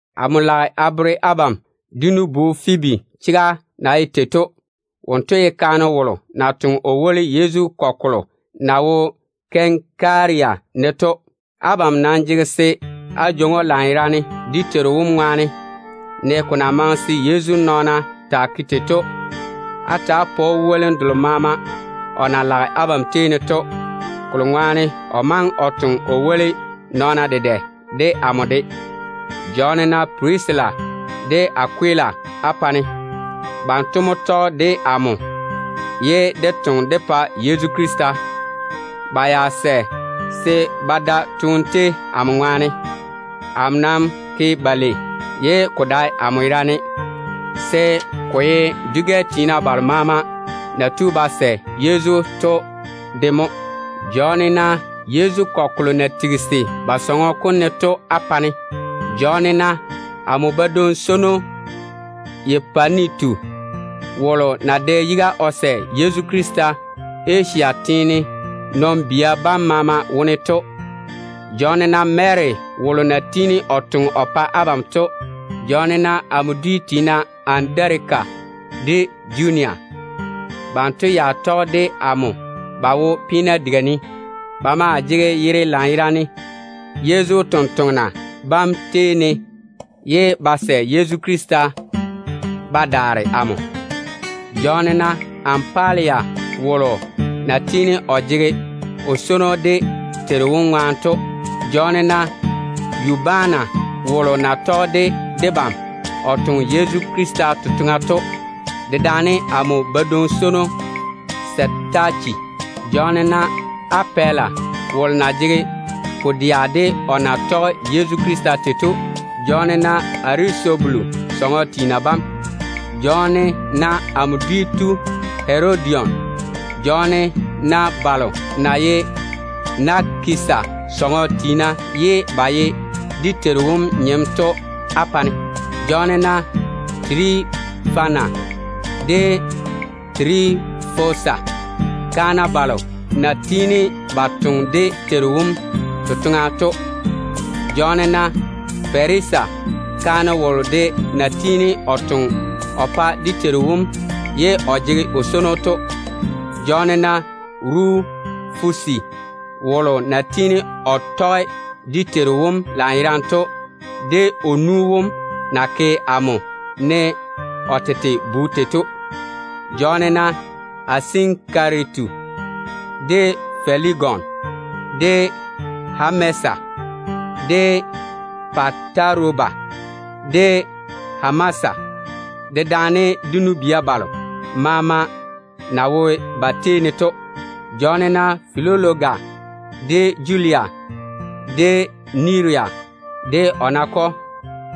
Amo lage a bere abam dé nu-bu Fwibi chega na ye tei to. Wonto ye kaane wolo na toŋe o woli Yezu kɔgɔ kolo na wo Kɛnkaria ne to. Abam nam jege se á jwoŋi‑o lanyerane dé Teiru wom ŋwaane, ne ko na maŋe se Yezu nɔɔna taa ke tei to. Á ta‑á pa‑o wolim delo maama o na lage abam tei ne to, kokuri to o maŋe o toŋe o woli nɔɔna dedɛ, de amo de. Jɔɔne-na Pirisila de Akwila á pa-ne. Banto mo tɔge de amo ye dé toŋe dé pa Yezu Krista. Ba ya sɛ se ba da toone tei amo ŋwaane. Amo nam ke-ba lei, ye ko dae amo yerane, se ko ye dwi-gɛ tiina balo maama na tu ba sɛ Yezu to de mo ke ba lei. Jɔɔne-na Yezu kɔgɔ kolo na jeeri ba sɔŋɔ kom ne to á pa-ne. Jɔɔne-na amo badwoŋ-swono Epanitu, wolo na dɛ yiga o sɛ Yezu Krista Asia teene dem maama wone to. Jɔɔne-na Mary wolo na tiini o toŋe o pa abam to. Jɔɔne-na amo chorro Andarika de Junia. Banto ya tɔge de amo ba wo peena diga ne. Ba maa jege yere lanyerane Yezu totoŋa nakwa bam tei ne, ye ba sɛ Yezu Krista ba daare amo. Jɔɔne-na Ampaliata wolo a na tiini a jege o swono dé Teiru wom ŋwaane to. Jɔɔne-na Yubana wolo na tɔge de debam o toŋe Yezu Krista totoŋa to, dedaane amo badwoŋ-swono Setache. Jɔɔne-na Apɛla wolo na jege pu-dɛa de o na tɔge Yezu Krista tei to. Jɔɔne-na Arisobulu sɔŋɔ tiina bam. Jɔɔne-na amo choro Hɛrodion. Jɔɔne-na balo na ye Nakisa sɔŋɔ tiina ye ba ye dé Teiru wom nyem to á pa-ne. Jɔɔne-na Tirifana de Tirifosa, kaana balo na tiini ba toŋe dé Teiru wom totoŋa to. Jɔɔne-na Perisa, kaane wolo de na tiini o toŋe o pa dé Teiru wom ye a jege o swono to. Jɔɔne-na Rufus wolo na yɔɔre o ye dé Teiru wom nyem to, de o nu wom na ke amo ne o tete bu tei to. Jɔɔne-na Asinkaritu, de Felegon, de Hɛmesi, de Pataroba, de Hɛmasa, dedaane de nu-bia balo maama na wo ba tei ne to. Jɔɔne-na Filologa, de Julia, de Neria de o nakɔ,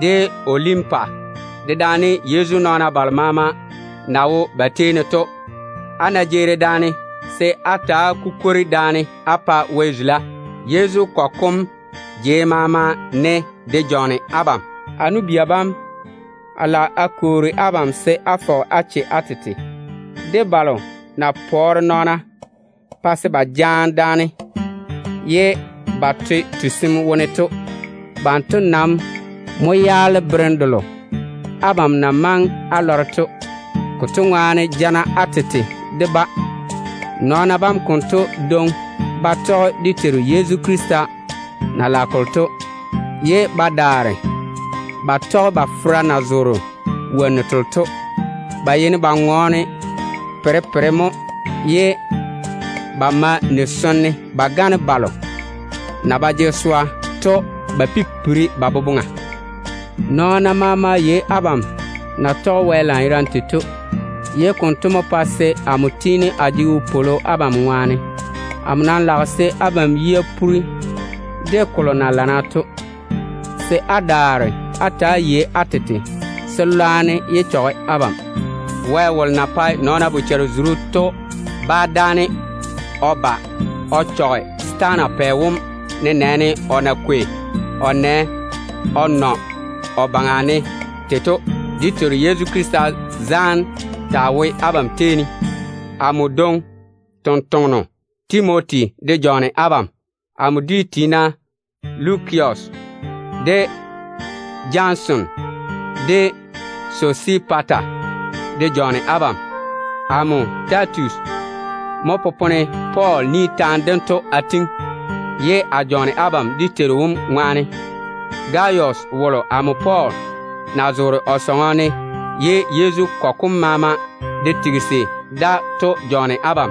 de Olimpa, dedaane Yezu nɔɔna balo maama na wo ba tei ne to. Á ná jeeri daane, se á ta‑á kukwori daane á pa Wɛ zula. Yezu Krista kɔgɔ kom na wo jei selo maama ne to de jɔɔne abam. A nu-bia bam, a lage a kwoori abam se á fɔge á che á tete de balo na pɔɔre nɔɔna pa se ba jaane daane ye ba to tusim wone to. Banto nam mo yaale berem delo abam na maŋe á lɔre to. Konto ŋwaane yɔɔre á nyaŋe-ba. Nɔɔna bam konto dwoŋi ba tɔge dé Teiru Yezu Krista na lage kolo to, ye ba daare ba tɔge ba fera na zoore wonnu telo to. Ba yeini ba ŋɔɔne botare-ywei mo, ye ba ma ni-sone ba gane balo na ba jege swa to ba pipiri ba boboŋa. Nɔɔna maama yei abam na tɔge Wɛ lanyerane tei to, ye konto mo pa se amo tiini a jege wopwolo abam ŋwaane. Amo nam lage se abam yia poore de kolo na lana to, se á daare á ta‑á yei á tete se lwarem yé chɔge abam. Wɛ wolo na pae nɔɔna bochare-zuru to bá dáane se o ba o chɔge setaana pɛ wom nenɛɛne á na kwei á nɛ á nɔ o baŋa ne tei to. Dé Teiru Yezu zaane dem taa wo abam tei ne. Amo dwoŋi tontoŋeno Timoti de jɔɔne abam. Amo dwi tiina Lukia, de Jason, de Sosipata de jɔɔne abam. Amo Tɛtius mo popone Pɔɔl ni taane dento a tiŋi, ye a jɔɔne abam dé Teiru wom ŋwaane. Gayus wolo amo Pɔɔl na zoore o sɔŋɔ ne ye Yezu kɔgɔ kom maama de jeeri da to jɔɔne abam.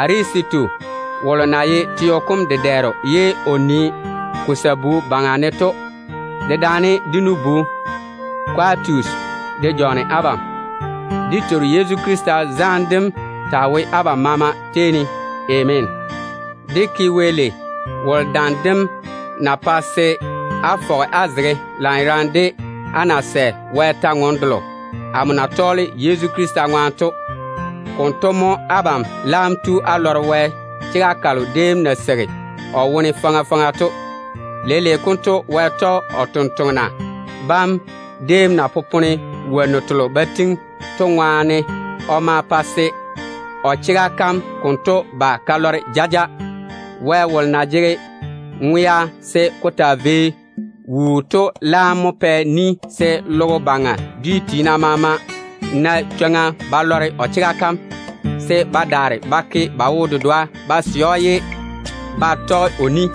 Erasitu wolo na ye teo kom dedɛɛro ye o nii ko sabu baŋa ne to, dedaane de nu-bu Kwatus de jɔɔne abam. [ Dé Teiru Yezu Krista zaane dem taa wo abam maama tei ne. Ameena.] Dé ke Wɛ lei. Wonto dam dem mo pae á fɔge á zege lanyerane de á na sɛ Wɛ kwor-ywoŋa kalo amo na tɔɔle Yezu Krista ŋwaane to. Konto mo abam laam tu á lɔre Wɛ chega kalo déem na seigi o wone faŋa faŋa to. Leile konto Wɛ tɔge o sampwori sem déem na popone wonnu telo ba tiŋi to ŋwaane o ma pa se o chega kam konto ba ka lɔre jaja. Wɛ wolo na jege ŋwea se ko taa vei wuu to laam mo pɛ ni se logo baŋa dwi maama na chwoŋa ba lɔre o chega kam, se ba daare ba ke ba wo-dedoa ded‑o ye ba tɔge o ni.